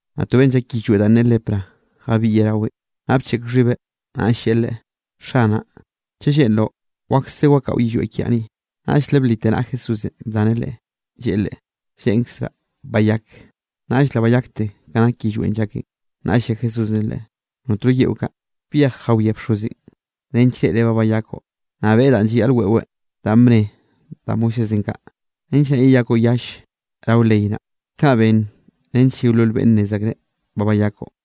Naꞌ to beꞌnn llak yillweꞌ danꞌ ne lepra jabiꞌyeꞌ raweꞌn, naꞌ bcheꞌk xhibeꞌ, naꞌll lleꞌe Leꞌe: —Xanaꞌ, chaꞌ lleꞌnroꞌ, wakse wakaꞌo yillweꞌ kiaꞌ ni. Naꞌll le blite naꞌa Jesúsenꞌ bdaneꞌ leꞌe, lleꞌe leꞌe: —Lleꞌnkzraꞌ, bayak. Naꞌll le bayakte ka nak yillweꞌn llakeꞌn. Naꞌll lle Jesúsenꞌ leꞌe: —Notno yeꞌo kaꞌ. Byej jawiá bxozenꞌ nench reꞌreꞌ ba bayakoꞌ. Naꞌ beꞌe danꞌ llayaꞌl weꞌweꞌ danꞌ bne da Moisésenꞌ kaꞌ, nench naꞌ yeyakoꞌ yall rao ley naꞌ. Kaꞌ ben nench yeolol beꞌnne nnez akreꞌ ba bayakoꞌ.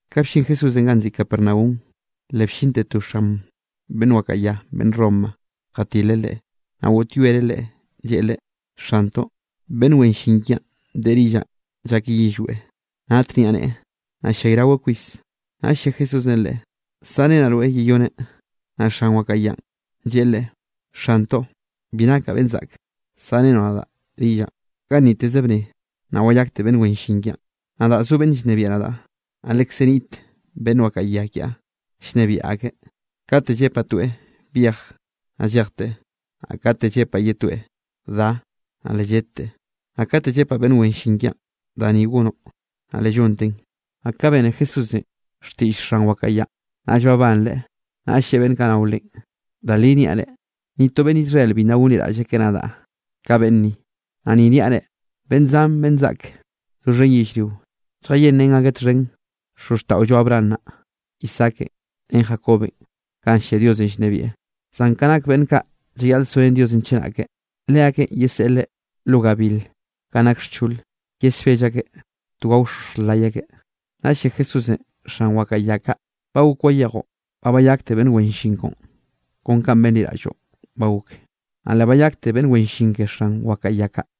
Ka bllin Jesúsenꞌ ganꞌ nziꞌi Capernaum, le bllinte to xan beꞌnn wakaꞌa ya beꞌnn Roma, jatileꞌ Leꞌe, naꞌ goꞌtyoereꞌ Leꞌe, lleꞌe Leꞌe: —Xantoꞌ, beꞌnn wen llin kiaꞌn deꞌe rillaꞌn llakeꞌ yillweꞌ, nat niaꞌneꞌe, naꞌ ll-llayraweꞌ kwis. Naꞌll lle Jesúsenꞌ leꞌe: —Saꞌrenaꞌ rweꞌ yeyoneꞌ. Naꞌ xan wakaꞌa yanꞌ lleꞌe Leꞌe: —Xantoꞌ, bi nakaꞌ beꞌnn zaꞌk saꞌrenoꞌ nadaꞌ rillaꞌn, ganniteze bnne, naꞌ wayakte beꞌnn wen llin kiaꞌn. Nadaꞌ zo beꞌnn llnebiaꞌ nadaꞌ, naꞌ lekze niꞌt beꞌnn wakaꞌa ya kiaꞌ llnebiaꞌ akeꞌ. Kate llepaꞌ toeꞌ: “Byej”, naꞌ llejteꞌ, naꞌ kate llepaꞌ ye toeꞌ: “Da”, naꞌ le lledteꞌ, naꞌ kate llepaꞌ beꞌnn wen llin kiaꞌn: “Da ni gonoꞌ”, naꞌ le llonteꞌn. Naꞌ ka bene Jesúsenꞌ xtiꞌll xan wakaꞌa yanꞌ, naꞌll babanreꞌ, naꞌll lleꞌe beꞌnn kaꞌ nao Leꞌen: —Da linꞌ niaꞌ reꞌ, ni to beꞌnn Israel bi nna gonliraꞌll akeꞌ nadaꞌ ka beꞌnn ni. Naꞌ ni niaꞌ reꞌ, beꞌnn zan beꞌnn zaꞌk doxhen yellrio, lljalleꞌrén akeꞌ txhen xozxtaꞌollo Abraham naꞌ, Isaakenꞌ ren Jacobenꞌ ganꞌ llia Diosenꞌ llnebieꞌ. Zan ka nak beꞌnn kaꞌ llayaꞌl so ren Diosenꞌ chenake, leakeꞌn yeseꞌleꞌ lo gabil ganꞌ nake xchole, yesbell akeꞌ to gaoxoxj lay akeꞌ. Naꞌll lle Jesúsenꞌ xan wakaꞌa ya kaꞌ: —Ba gok wayejoꞌ, ba bayakte beꞌnn wen llin koꞌon kon kanꞌ benliraꞌlloꞌn ba gok. Naꞌ le bayakte beꞌnn wen llin ke xan wakaꞌa ya kaꞌ.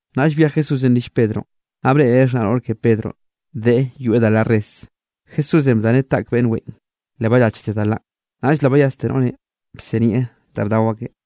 Naꞌll byej Jesúsenꞌ rill Pedronꞌ, naꞌ breꞌreꞌ xhnaꞌ noꞌr ke Pedronꞌ deꞌe yoeꞌ da la res. Jesúsenꞌ bdaneꞌ taꞌk beꞌnn weꞌen, le ballachte da lanꞌ. Naꞌll le bayaste noꞌrenꞌ bsinieꞌ da bdao akeꞌ.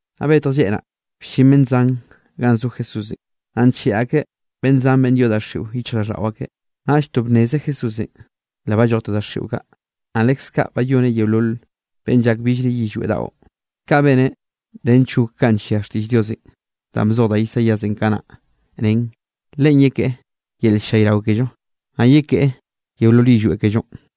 Naꞌ betj lleꞌ naꞌ, bllin beꞌnn zan ganꞌ zo Jesúsenꞌ, naꞌ ncheꞌe akeꞌ beꞌnn zan beꞌnn yoꞌ daxiꞌo yichjraꞌlldaꞌo akeꞌ. Naꞌll to bnneze Jesúsenꞌ, le ballojte daxiꞌo kaꞌ, naꞌ leskaꞌ bayoneꞌ yeolol beꞌnn llak billre yillweꞌ daꞌo. Kaꞌn beneꞌ nench gok kanꞌ llia xtiꞌll Diosenꞌ danꞌ bzoj da Isaíasenꞌ kanaꞌ, nen: “Leꞌen yekeꞌe yel ll-llayrao kello, naꞌ yekeꞌe yeolol yillweꞌ kellonꞌ.”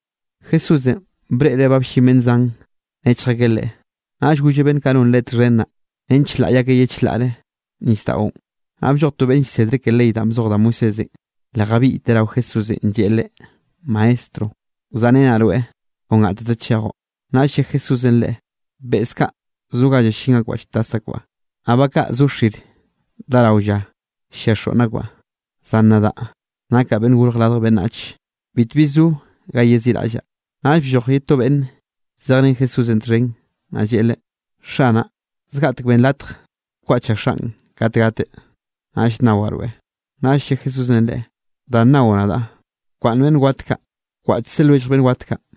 Jesúsenꞌ breꞌreꞌ ba bllin beꞌnn zan nechj akeꞌ Leꞌe, naꞌll golleꞌ beꞌnn kaꞌ non Leꞌe txhen naꞌ nench laꞌy akeꞌ ye chlaꞌre nisdaꞌon. Naꞌ blloj to beꞌnn llsedre ke ley danꞌ bzoj da Moisésenꞌ, le jabiꞌyteꞌ rao Jesúsenꞌ lleꞌe Leꞌe: —Maestro, wzaꞌrenaꞌ rweꞌ kon gateze chejoꞌ. Naꞌll lle Jesúsenꞌ Leꞌe: —Beꞌz kaꞌ zo ga llallín akbaꞌ lltas akbaꞌ, naꞌ ba kaꞌ zo xir dá rao lla, llia xoꞌnn akbaꞌ, zan nadaꞌ, nakaꞌ Beꞌnnenꞌ Gorj Radj Beꞌnnach, bitbi zo ga yeziꞌraꞌllaꞌ. Naꞌll blloj ye to beꞌnn zejrén Jesúsenꞌ txhen, naꞌ lleꞌe Leꞌe: —Xanaꞌ, zgaꞌtek benn latj wkwaꞌchaꞌ xaꞌn kate gateꞌ, naꞌll nnawaꞌ rweꞌ. Naꞌll lle Jesúsenꞌ leꞌe: —Da nnao nadaꞌ, bkwaꞌnn beꞌnn wat kaꞌ, wkwaꞌchze lwellj beꞌnn wat kaꞌ.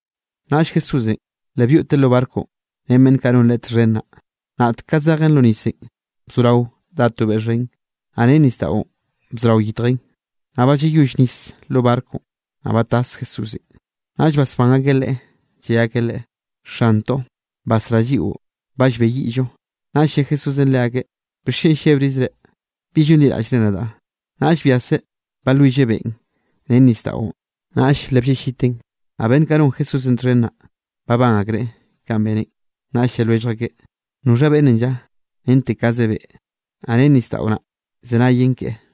Naꞌll Jesúsenꞌ, le byoꞌteꞌ lo barconꞌ ren beꞌnn kaꞌ non Leꞌe txhen naꞌ. Naꞌt ka zejen lo nisenꞌ, bzorao dá to beꞌ xhen, naꞌ ren nisdaꞌon bzorao yitjen, naꞌ ba llayoll nis lo barconꞌ, naꞌ ba tas Jesúsenꞌ. Naꞌll basbán akeꞌ Leꞌe, lle akeꞌ Leꞌe: —¡Xantoꞌ, basrá lliꞌo, ba llbeyiꞌllo! Naꞌll lle Jesúsenꞌ leakeꞌ: —¿Bixchen llebrizre? ¿Bi llonliraꞌllre nadaꞌ? Naꞌll byaseꞌ balwilleꞌ beꞌn ren nisdaꞌon, naꞌll le blleꞌlliten. Naꞌ beꞌnn kaꞌ non Jesúsenꞌ txhen naꞌ, babán akreꞌ kanꞌ beneꞌn. Naꞌll lle lwellj akeꞌ: —¿Noxha beꞌnnenꞌ lla? Rente kaze beꞌ, naꞌ ren nisdaꞌo naꞌ llzenayen keꞌe.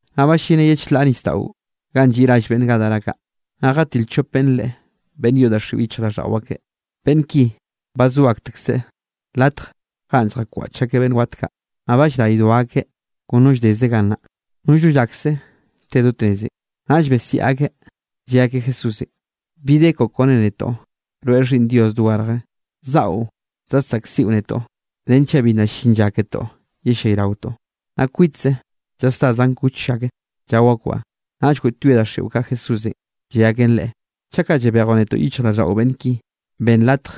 Naꞌ ballineꞌ ye chlaꞌ nisdaꞌon ganꞌ lliꞌ rall beꞌnn Gadara kaꞌ. Naꞌ jatil chop beꞌnne Leꞌe, beꞌnn yoꞌ daxiꞌo yichjraꞌlldaꞌo akeꞌ. Beꞌnn ki ba zo aktekzeꞌ latj ganꞌ lljakwaꞌch akeꞌ beꞌnn wat kaꞌ, naꞌ ba llraydo akeꞌ kon no lldeze gannaꞌ, nollno llakse te do tnezenꞌ. Naꞌll besiaꞌ akeꞌ, lle akeꞌ Jesúsenꞌ: —¿Bi de koꞌo kone netoꞌ? Rweꞌ Xhiꞌnn Dios dogarje. ¿Zaꞌo zadsaꞌkziꞌo netoꞌ, renchaꞌ bi nna llin lla ketoꞌ yellayraotoꞌ? Naꞌ kwitze llasdá zan kuch ak, llao akbaꞌ. Naꞌll goꞌtyoe daxiꞌo kaꞌ Jesúsenꞌ, lle aken Leꞌe: —Chaꞌ kaꞌ yebejoꞌ netoꞌ yichjraꞌlldaꞌo beꞌnn ki, benn latj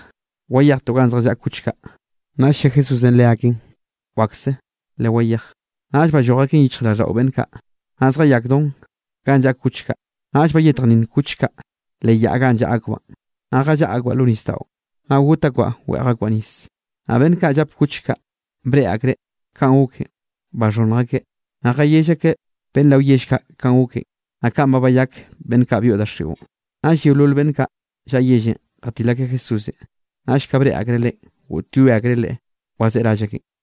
wayejtoꞌ ganꞌ zjallaꞌa kuch kaꞌ. Naꞌll lle Jesúsenꞌ leaken: —Wakse, lewayej. Naꞌll balloj aken yichjraꞌlldaꞌo beꞌnn kaꞌ, naꞌ zjayakdon ganꞌ llaꞌa kuch kaꞌ. Naꞌll bayetjnninn kuch kaꞌ leꞌ yaꞌ ganꞌ llaꞌa akbaꞌn, naꞌ jallaꞌa akbaꞌ lo nisdaꞌon, naꞌ got akbaꞌ weꞌj akbaꞌ nis. Naꞌ beꞌnn kaꞌ llap kuch kaꞌ, breꞌe akreꞌ kanꞌ goken, baxhonnj akeꞌ, naꞌ jayell akeꞌ beꞌnn rao yell kaꞌ kanꞌ goken, naꞌ kanꞌ ba bayak beꞌnn kaꞌ byoꞌ daxiꞌon. Naꞌll yeolol beꞌnn kaꞌ llaꞌa yellenꞌ jatil akeꞌ Jesúsenꞌ, naꞌll ka breꞌe akreꞌ Leꞌen, goꞌtyoe akreꞌ Leꞌe wazeꞌe rall akenꞌ.